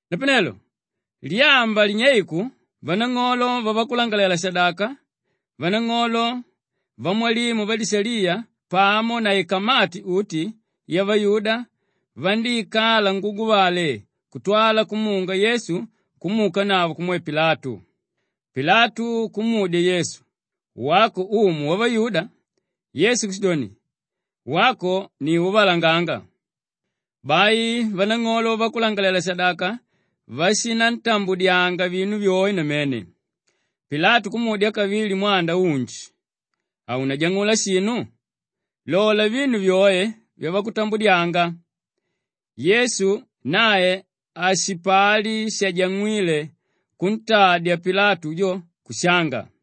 Napanelo lyamba linyeiku vanang'olo vavakulangalalela-shadaka, vanang'olo, vamwalimu vadishaliya pamo na ikamati uti yavayuda vandíikala nguguvale kutwala kumunga Yesu kumuukanavo kumwe Pilatu. Pilatu kumudya Yesu, “Wako umu wavayuda?” Yesu kushidoni, “Wako ni úvalanganga.” Bai vanang'olo vavakulangalalela-shadaka vashinantambudyanga vinu vyoe namene. Pilatu kumudya kavili mwanda unji, “Haunajang'ula shinu? Lola vinu vyoe vyavakutambudyanga.” Yesu nae hashipali shajang'wíle kuntadya Pilatu jo kushanga.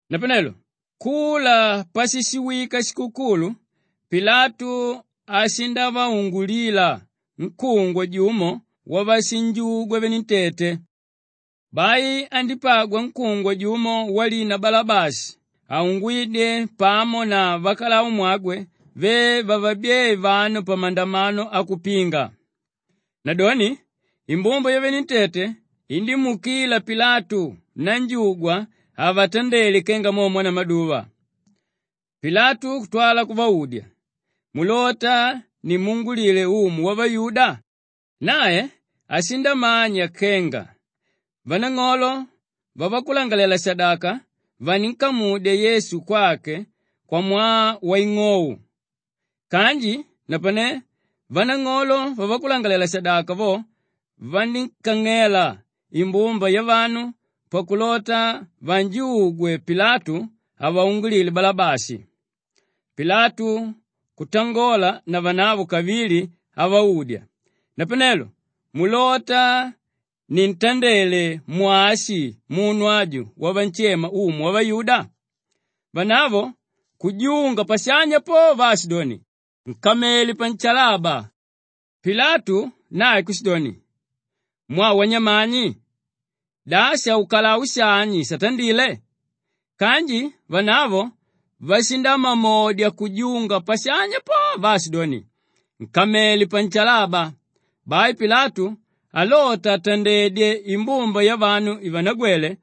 Napanelo kula pashishiwika shikukulu, Pilatu ashindavaungulila nkúngwa jumo wavashinjugwa venentete. Bai andípagwa nkúngwa jumo walina Balabashi aungwídye pamo na vakalaumwagwe ve vavabyée vanu pamandamano akupinga. Nadoni imbumba yavenentete indímuukila Pilatu nanjugwa avatandele kenga mo mwanamaduva. Pilatu kutwala kuvaudya, “Mulota nimuungulile umu wavayuda?” Nae ashindamanya kenga vanang'olo vavakulangalalela-shadaka vaninkamudya Yesu kwake kwamwaa waing'ou. Kanji napane vanang'olo vavakulangalalela-shadaka vo vandíkang'ela imbumba yavanu pakulota vanjugwe Pilatu avaungulile Balabashi. Pilatu kutangola navanavo kavili avaudya, “Napanelo mulota nintandele mwashi munu aju wamunshema umu wavayuda?” Vanavo kujunga pashanya po vaashidoni, “Nkamele panshalaba!” Pilatu nae kushidoni, “Mwaa wanyamani? Da shaukalau shani shatandile?” Kanji vanavo vashindamamodya kujunga pashanya po vaashidoni, “Nkamele panshalaba!” Bai Pilatu alota atendedye imbumba yavanu ivanagwele,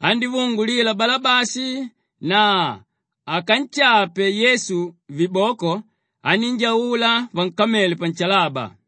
andívaungulila Balabashi na akanshape Yesu viboko anínjaula vankamele panshalaba.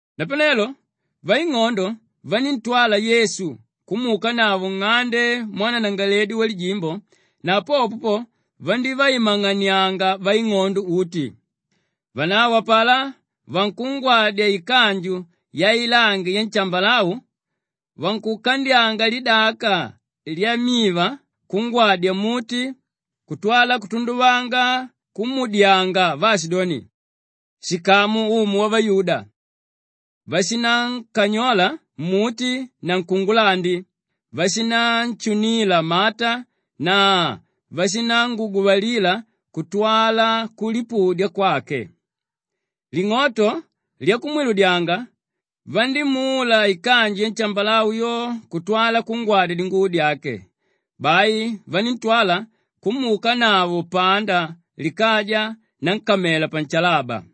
Napanelo vaing'ondo vaníntwala Yesu kumuukanavo nng'ande mwananangalaledi walijimbo na popo po, vandívaimang'anianga vaing'ondo uti. Vanavo apalá vankungwadya ikanju yailangi yanshambalau, vankukandyanga lidaka lyamiva kungwadya mmuti kutwala kutunduvanga kumuudyanga vaashidoni, “Shikamu umu wavayuda.” Vashinankanyola mmuti na nkungulandi, vashinanshunila mata na vashinanguguvalila kutwala kulipudya kwake. Ling'oto lyakumwiludyanga, vandímula ikanju yanshambalau yo kutwala kungwadya dinguvo dyake. Bai vaníntwala kumuukanavo panda likaja nankamela panshalaba.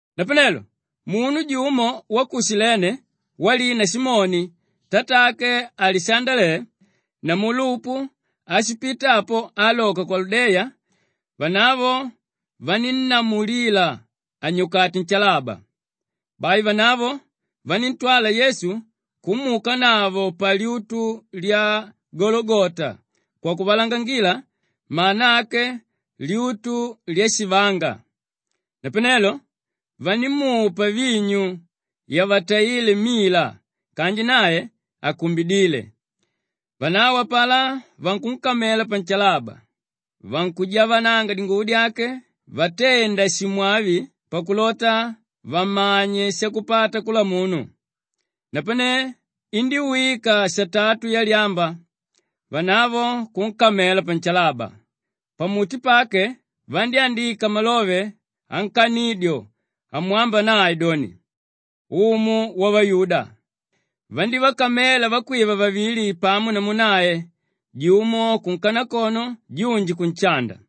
Napanelo munu jumo wa ku Shilene walina Simoni tatake Alishandale namu Lupu ashipita apo aaloka kwaludeya, vanavo vanínnamulila anyukate nshalaba. Bai vanavo vaníntwala Yesu kumuukanavo palyutu lya Gologota kwakuvalangangila mana ake lyutu lyashivanga. Napanelo vandímupa vinyu yavataíle mila kanji nae hakumbidíle. Vanavo apalá vankunkamela panshalaba, vankujavananga dinguvo dyake vatenda shimwavi pakulota vamanye shakupata kula munu. Napane indíwika satatu yalyamba, vanavo kunkamela panshalaba. Pamuti pake vandyándika malove ankanidyo amwamba nae doni, “Umu Wavayuda.” Vandívakamela vakwiva vavili pamo namu nae, jumo kunkanakono junji kunshanda.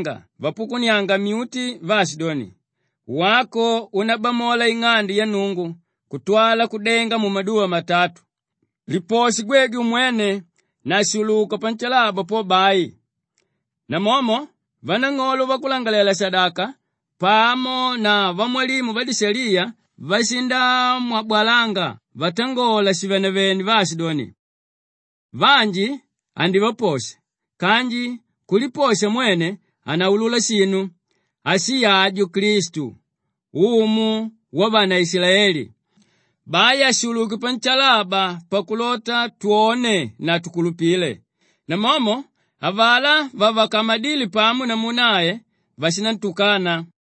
Vanu váshipita apo vashindamwabalanga vaapukunianga myuti vaashidoni, “Wako únabamola ing'ande ya Nnungu kutwala kudenga mumaduva matatu, liposhe gwegwe umwene na shuluka panshalaba po bai.” Namomo vanang'olo vavakulangalalela-shadaka pamo na vamwalimu vadishaliya vashindamwabwalanga vatangola shivenevene vaashidoni, “Vanji andivaposha kanji kuliposha mwene hanaulula shinu! Ashi aju, Klistu, Umu Wavanaishilaeli! Bai ashuluke panshalaba pakulota twone na tukulupile.” Namomo avalá vavakamadíle pamo namu nae vashinantukana.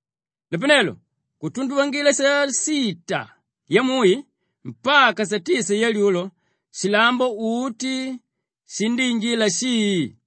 Napanelo kutunduvangila sasita yamui mpaka satisa yalyulo, shilambo uti shindíinjila shii.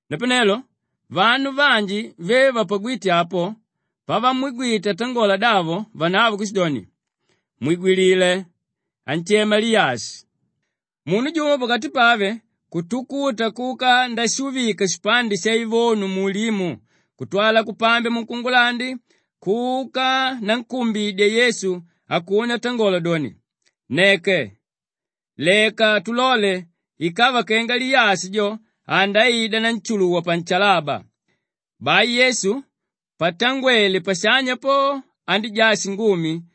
Napanelo vanu vanji ve vapagwíte apo, pavamwigwite atangola davo vanavo kushidoni, “Mwigwilile! Anshema Liyashi.” Munu jumo pakati pave kutukuta kuka ndashuvika shipande shaivonu muulimu kutwala kupambya munkungulandi kuka nankumbidya Yesu akune atangola doni, “Nneke! Leka tulole ikava kenga Liyashi jo andaida nanshuluwa panshalaba.” Bai Yesu patangwele pashanya po andíjaa shingumi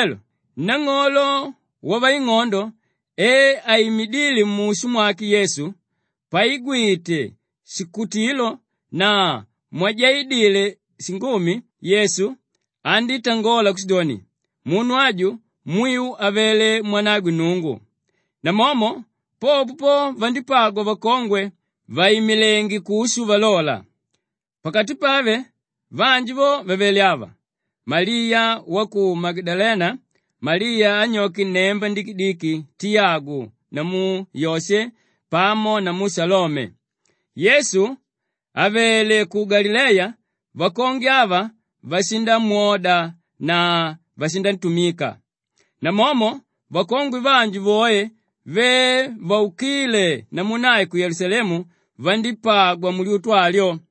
Napanelo nang'olo wavaing'ondo e aimidíle mushu mwake Yesu, paigwite shikutilo na mwajaidile shingumi Yesu, andítangola kushidoni, “Munu aju mwiu avele mwanagwe Nnungu.” Namomo popo po, vandípagwa vakongwe vàimilenge kushu valola. Pakati pave vanji vo vavele ava: Maliya wa ku Magadalena, Maliya anyoke nnemba ndikidiki Tiyagu namu Yoshe pamo namu Shalome. Yesu àvele ku Galileya vakongwe ava vashindamwoda na vashinantumika. Namomo vakongwe vanji voe ve vaukíle namu nae ku Yelusalemu vandípagwa mulyutu alyo.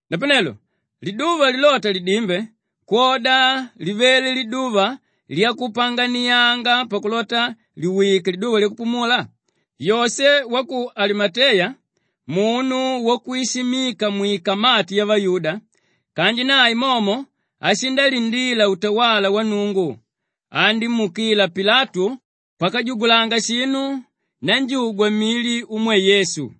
Napanelo liduva lilota lidimbe, kwoda livele liduva lyakulipanganianga pakulota liwike liduva lyakupumula, Yoshe wa ku Alimateya munu wakwishimika mwikamati yavayuda kanji nanae momo ashindalindila utawala wa Nnungu, andímuukila Pilatu pakajugulanga shinu nanjugwa mili umwe Yesu.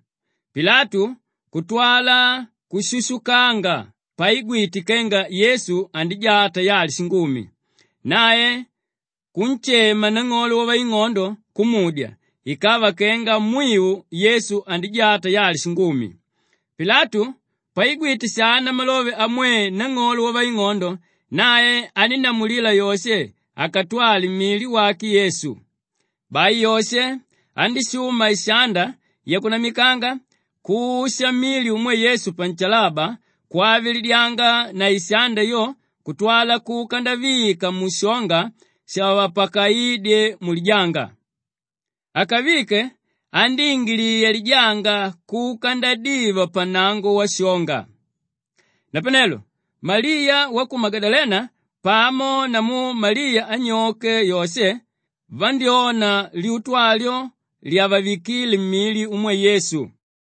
Pilatu kutwala kushushukanga paigwite kenga Yesu andijaa tayali shingumi. Nae kunshema nang'olo wavaing'ondo kumudya ikava kenga mwiu Yesu andíjaa tayali shingumi. Pilatu paigwite shana malove amwe nang'olo wavaing'ondo, nae anínnamulila Yoshe akatwale mili wake Yesu. Bai Yoshe andíshuma ishanda yakunamikanga kusha mili umwe Yesu panshalaba kwavilidyanga na ishanda yo kutwala kuka ndavika mushonga shavapakaídye mulijanga. Akavike, andíingiliya lijanga kuka ndadiva pannango washonga. Napanelo Maliya wa ku Magadalena pamo namu Maliya anyoke Yoshe vandyóna lyutu alyo lyavavikíle mili umwe Yesu.